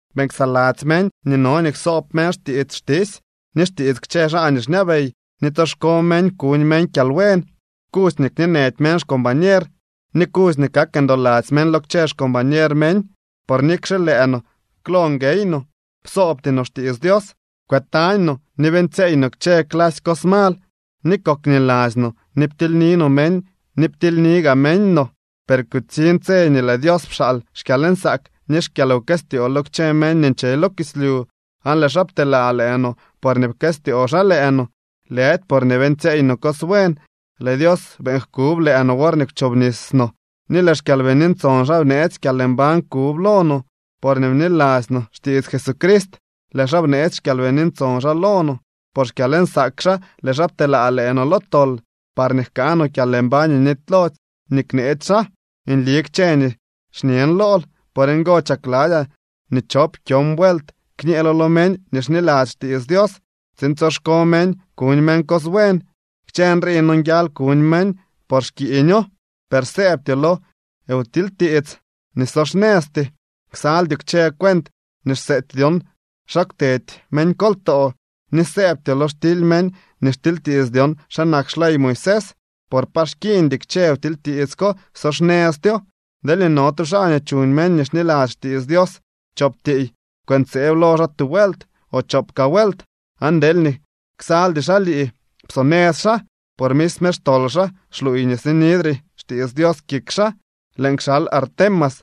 Beeñ ksaladzy meñ nii no nii ksoob meñ xtiits xtisy ni xtiits kchë xaa nii xñabey, ni tsoxko meñ kuñ meñ kyalbuen. Kudzy nii kñeenëdy meñ xcombañer, ni kudzy nii kak ndoladzy meñ lo kchë xcombañer meñ. Por nikle lëë no klo nguey no, psoobty no xtiits Dios. Kwëtañ no ni beeñtsyeey no kchë clasy cos mal ni kokniladzy no ni ptiilyni no meñ ni ptilyni gaa meñ no. Per kutsiñ tse nii lëë Dios pxaal xkyalnsaak ni xkyalwkëstyoo lo kchë meñ nii nche lo kislyu, aan lëë xaa pteelaa lëë no porñee pkëstyoo xaa lëë no, lëdy porñee beeñtsyeey no cos buen. Lëë Dios beeñ jkub lëë no worñee kwchobnis no ni lëë xKyalbini Ntson xaa bneetsy kyalmbañ kub lo no. Porñee bniladzy no xtiits Jesucrist lëë xaa bneetsy xKyalbini Ntson xaa lo no. Por xkyalnsaak xaa lëë xaa pteelaa lëë no lo tol parñee jkaa no kyalmbañ nii nitylody nii kneetsy xaa. Nli kchë nii xñen lool. Por ngo chakladzyaa nii chop kyon vuelt kñeelo lo meñ nii xniladzy xtiits Dios tsiin tsoxko meñ kuñ meñ cos buen. Kchë nrii nonguial kuñ meñ por xkiiño. Per sëëbtyoo lo wtilytiits nii so xnëzty, ksaldyoo kchë cuent nii xseety dyon xa kwtedy meñkoltoo, ni sëëbtyoo lo xtily meñ nii xtilytiits dyon xa nak xley Moisés. Por pa xkiiñdy kchë wtilytiits ko, so xnëztyo. Deelñee no tu xaa nii chuñ meñ nii xniladzy xtiits Dios chop tiiy, kwëntseeb lo xaa tu vuelt o chop kaa vuelt, aan deelñee ksaldy xaa lii, psonëz xaa. Por misme xtol xaa xluuy nii sinidre xtiits Dios kik xaa. Lëën kxal Artemas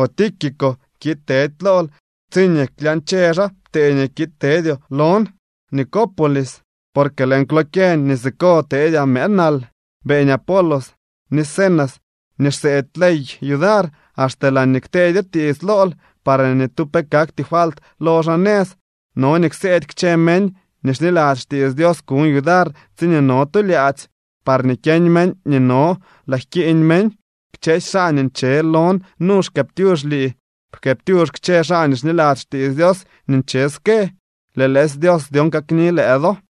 o Tíquico kiid tedy lool tsiñee klyañche xaa ptee nii kiid tedyoo lon Nicópolis, porque lëën kwlokyeñ nii siko teedyaa mëë nal. Beeñ Apolos ni Zenas nii xseedy ley yudar axte laañee kteedyo tiits lool parñee ni tu pe kakty falt lo xaa nëz. No nii kseedy kchë meñ nii xniladzy xtiits Dios kuñ yudar tsiñee no tu lyaadzy, parñee kyeñ meñ nii no laa jkiiñ meñ. Kchësy xaa nii nche lon nu xkëëptyux lii. Pkëëptyux kchë xaa nii xniladzy xtiits Dios nii nche ske. Lëë lëësy Dios dyon kakni lëë do.